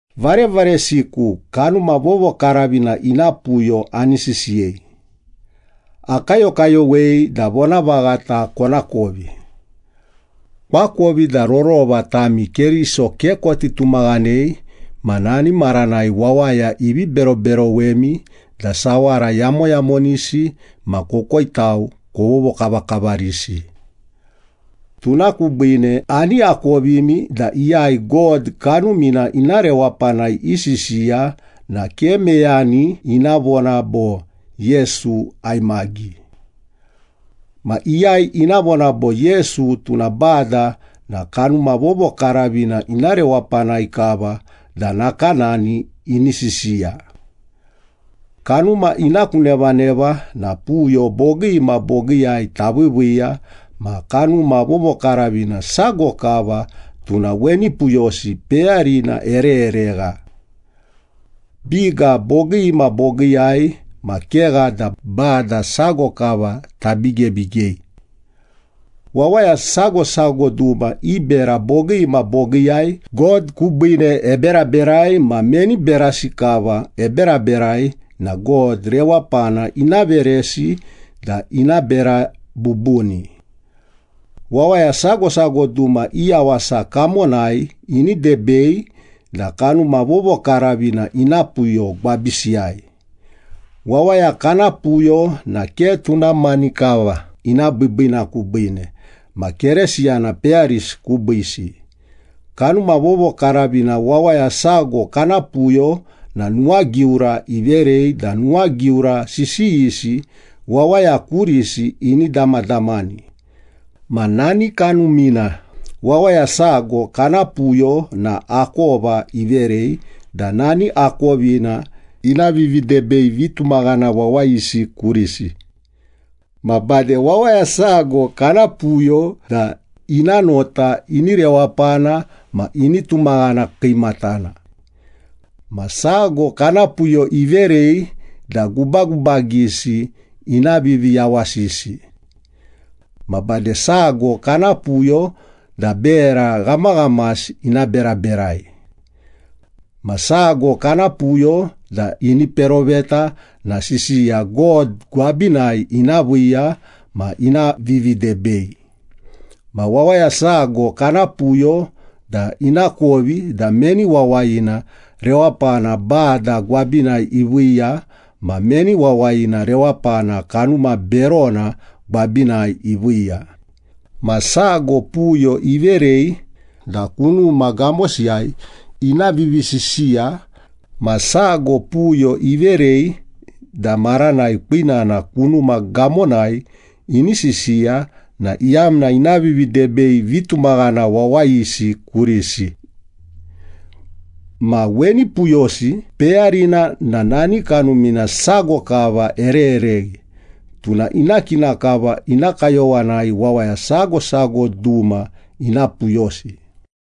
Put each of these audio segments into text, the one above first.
Varevaresiku, Kanuma Vovokaravina ina puyo ani sisiyei. Akayokayowei da vonavaghata konakovi. Koakovi da rorova tami Keriso ke koti tumaghanei ma nani maranai wawaya ivi beroberowemi da sawara yamoyamonisi ma kokoitau kovovokavakavarisi. Tuna kubiine ani akovimi da iyai God Kanumina ina rewapanai isisiya na ke meyani ina vona bo, “Yesu aimagi.” Ma iyai ina vona bo, “Yesu tuna Bada” na Kanuma Vovokaravina ina rewapanai kava da nakanani ini sisiya. Kanuma ina ku nevaneva na puyo bogii ma bogiiyai taviiviiya, ma Kanuma Vovokaravina sago kava, tuna weni puyosi peyarina erereregha. Biga bogii ma bogiiyai ma kegha da Bada sago kava tabigebigei. Wawaya sago sago duma i bera bogii ma bogiiyai God kubiine eberaberai ma meni berasi kava eberaberai na God rewapana ina veresi da ina bera bubuni. Wawaya sago sago duma i yawasa kamonai ini debei da Kanuma Vovokaravina ina puyo gwabisiyai. Wawaya kana puyo na ke tuna mani kava ina biibiina kubiine, ma Keresiyana peyarisi kubiisi. Kanuma Vovokaravina wawaya sago kana puyo na nuwagiura iverei da nuwagiura sisiyisi wawaya kurisi ini damadamani. Ma nani Kanumina wawaya sago kana puyo na akova iverei da nani akovina ina vividebei vitumaghana wawayisi kurisi. Ma bade wawaya sago kana puyo da ina nota ini rewapana ma ini tumaghana kiimatana. Ma sago kana puyo iverei da gubagubagisi ina viviyawasisi. Ma bade sago kana puyo da bera ghamaghamasi ina beraberai. Ma sago kana puyo da ini peroveta na sisiya God gwabinai ina viiya ma ina vividebei. Ma wawaya sago kana puyo da inakovi da meni wawayina rewapana Bada gwabinai iviiya ma meni wawayina rewapana kanuma berona gwabinai iviiya. Ma sago puyo iverei da kunuma gamosiyai ina vivisisiya. Ma sago puyo iverei da maranai kwinana kunuma gamonai ini sisiya na iyamna ina vividebei vitumaghana wawayisi kurisi. Ma weni puyosi peyarina na nani Kanumina sago kava ererereghi, tuna ina kina kava ina kayowanai wawaya sago sago duma ina puyosi.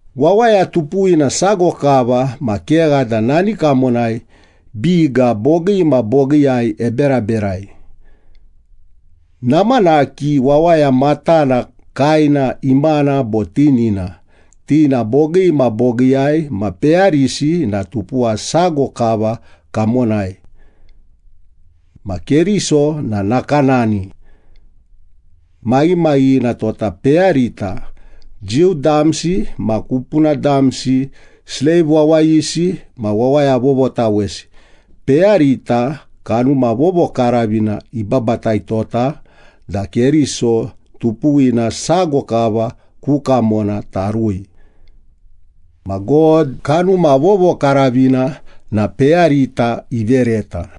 Wawaya tupuwina sago kava ma kegha da nani kamonai biga bogii ma bogiiyai eberaberai. Namanaki wawaya matana, kaena, imana bo tinina, ti na bogii ma bogiiyai, ma peyarisi na tupuwa sago kava kamonai. Ma Keriso na nakanani. Maghimaghighina tota peyarita, Jiu damsi ma kupuna damsi, sleiv wawayisi ma wawaya vovotawesi, peyarita Kanuma Vovokaravina ibabataitota da Keriso tupuwina sago kava ku kamona tarui. Ma God, Kanuma Vovokaravina na peyarita ivereta.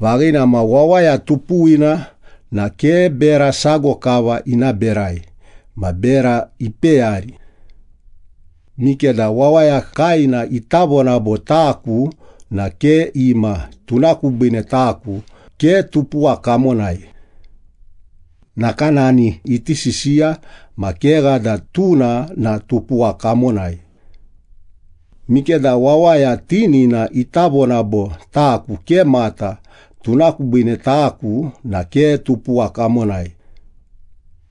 Vaghina ma, wawaya tupuwina na ke bera sago kava ina berai ma bera ipeyari. Mikeda wawaya kaena ita vona bo, “Taku na ke ima, tuna kubiine taku ke tupuwa kamonai.” Nakanani iti sisiya ma kegha da tuna na tupuwa kamonai. Mikeda wawaya tinina ita vona bo, “Taku ke mata, tuna kubiine taku na ke tupuwa kamonai.”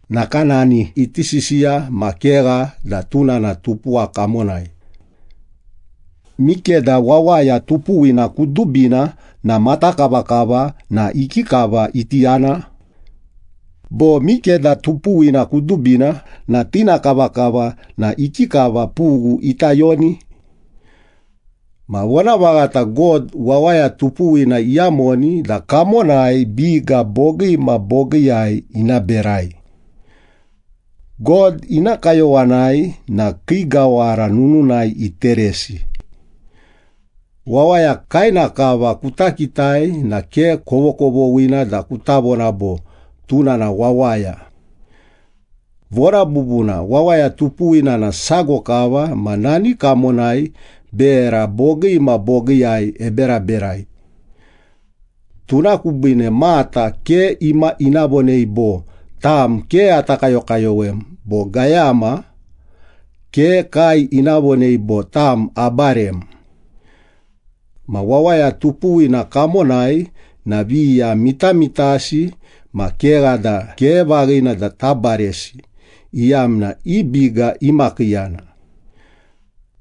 Nakanani iti sisiya ma kegha da tuna na tupuwa kamonai. Mikeda wawaya tupuwina kudubina na mata kavakava na ikikava iti yana? Bo mikeda tupuwina kudubina na tina kavakava na ikikava pughu ita yoni? Ma vonavaghata, God wawaya tupuwina iyamoni da kamonai biga bogii ma bogiiyai ina berai. God ina kayowanai na kii gawara nununai iteresi. Wawaya kaena kava kuta kitai na ke kovokovoghina da kuta vona bo, “Tuna na wawaya.” Vona bubuna, wawaya tupuwina na sago kava ma nani kamonai bera bogii ma bogiiyai eberaberai. Tuna kubiine mata ke ima ina vonei bo, “Tam ke ata kayokayowem,” bo gayama ke kae ina vonei bo, “Tam, abarem.” Ma wawaya tupuwina kamonai na viya mitamitasi ma kegha da ke vaghina da tabaresi, iyamna i biga imakiiyana.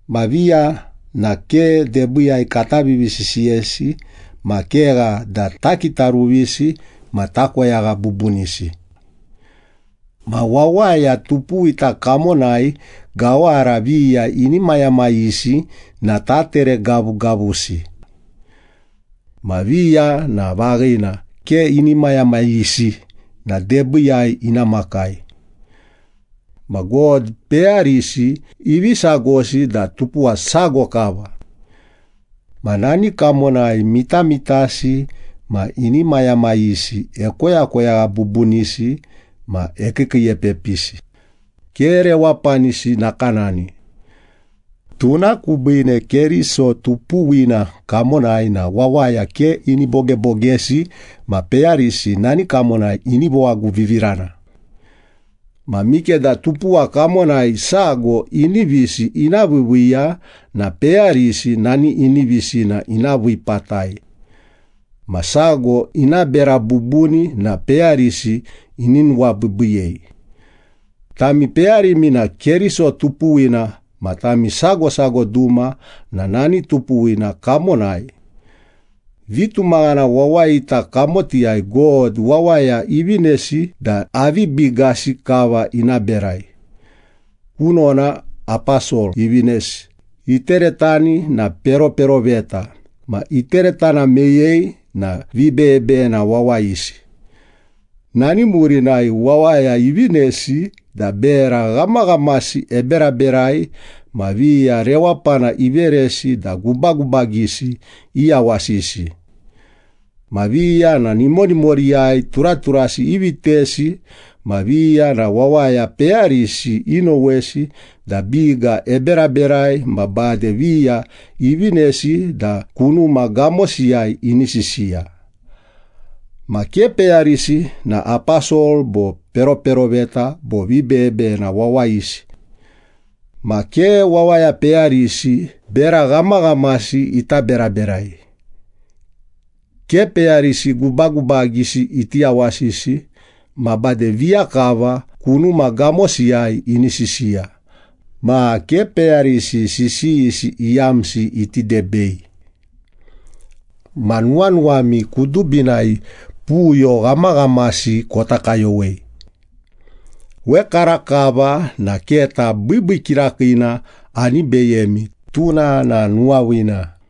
Ma viya na ke debiiyai kata vivisisiyesi ma kegha da takitaruvisi ma takoyagha bubunisi. Ma wawaya tupuwita kamonai gawara viya inimayamayisi na tatere gavugavusi. Ma viya na vaghina, ke inimayamayisi na debiiyai ina makai. Ma God peyarisi ivi sagosi da tupuwa sago kava. Ma nani kamonai mitamitasi ma inimayamayisi ekoyakoyagha bubunisi ma ekiikiiepepisi, ke rewapanisi nakanani. Tuna kubiine Keriso tupuwina kamonai na wawaya ke ini bogebogesi ma peyarisi nani kamonai ini vowaguvivirana. Ma mikeda tupuwa kamonai sago inivisi ina viiviiya na peyarisi nani inivisina ina vii patai. Ma sago ina bera bubuni na peyarisi ini nuwabiibiiyei. Tami peyarimi na Keriso tupuwina ma tami sago sago duma na nani tupuwina kamonai. Vitumaghana wawayita kamotiyai God, wawaya ivinesi da avi bigasi kava ina berai. Kunona aposol ivinesi, iteretani na peroperoveta, ma iteretana meyei na vibeyebeyena wawayisi. Nani murinai wawaya ivinesi da bera ghamaghamasi eberaberai ma viya rewapana iveresi da gubagubagisi iyawasisi. Ma viya na nimonimoriyai turaturasi ivitesi, ma viya na wawaya peyarisi inowesi da biga eberaberai ma bade viya ivinesi da kunuma gamosiyai ini sisiya. Ma ke peyarisi na aposol bo peroperoveta bo vibeyebeyena wawayisi. Ma ke wawaya peyarisi bera ghamaghamasi ita beraberai. Ke peyarisi gubagubagisi iti yawasisi, ma bade viya kava kunuma gamosiyai ini sisiya, ma ke peyarisi sisiyisi iyamsi iti debei. Ma nuwanuwami kudubinai puyo ghamaghamasi kota kayowei. Wekarakava na keta biibii kirakiina ani beyemi, tuna na nuwaviina.